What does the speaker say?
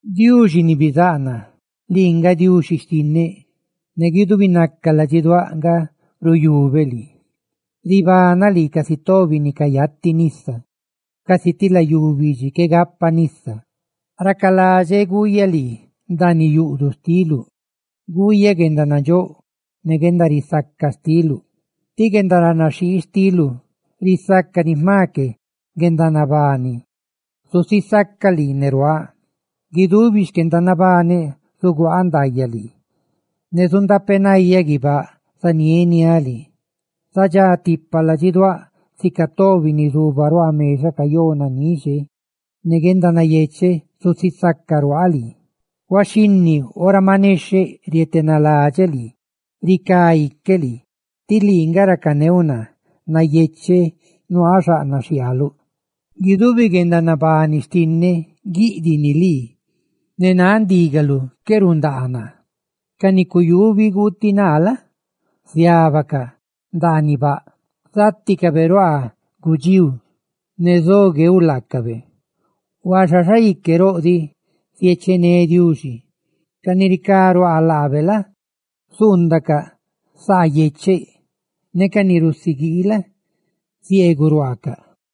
¡Diuxi ni bizáꞌ naa, lii nga Diuxi xtinneꞌ! Ne guidubinaca ladxiduáꞌ nga ruyubeꞌ lii, casi tobi ni cayati nisa; ne guidubinaca ladxiduáꞌ ribanaꞌ lii, casi ti layú bidxi qué gapa nisa. ¡Racaladxeꞌ guuyaꞌ lii ndaaniꞌ yuꞌduꞌ xtiluꞌ, guuyaꞌ guendanandxóꞌ ne guendarisaca xtiluꞌ, tí guendaranaxhii xtiluꞌ risácani jma que guendanabani! Zusisaca lii ne ruaaꞌ; guidubi xquendanabaneꞌ zaguaaꞌ ndaayaꞌ lii, ne zundapenayáꞌ guibáꞌ zanieniáꞌ lii. Zadxá tipa ladxiduáꞌ, sica tobi ni zuba ruaa mexaꞌ cayó nanixe, ne guendanayecheꞌ zusisaca ruaaꞌ lii. Huaxhinni, ora maꞌ nexheꞌ, rietenaladxeꞌ lii ne ricá iqueꞌ lii; tí lii nga racaneuꞌ naa. ¡Nayecheꞌ nuaaꞌ xaꞌnaꞌ xhiaaluꞌ! Guidubi guendanabani xtinneꞌ guiꞌdiꞌ ni lii, ne náꞌ ndígaluꞌ qué rundaa naa. Ca ni cuyubi guutiꞌ naa la? ziábaca ndaaniꞌ baꞌ; ¡záticabe ruaa gudxíu, ne zo gueuꞌ laacabe! Huaxa xaique roꞌ diꞌ ziechené Diuxi; ca ni ricá ruaa laabe la? zuundacaꞌ saa yecheꞌ, ne ca ni rusiguii la? zieeguꞌ ruaacaꞌ.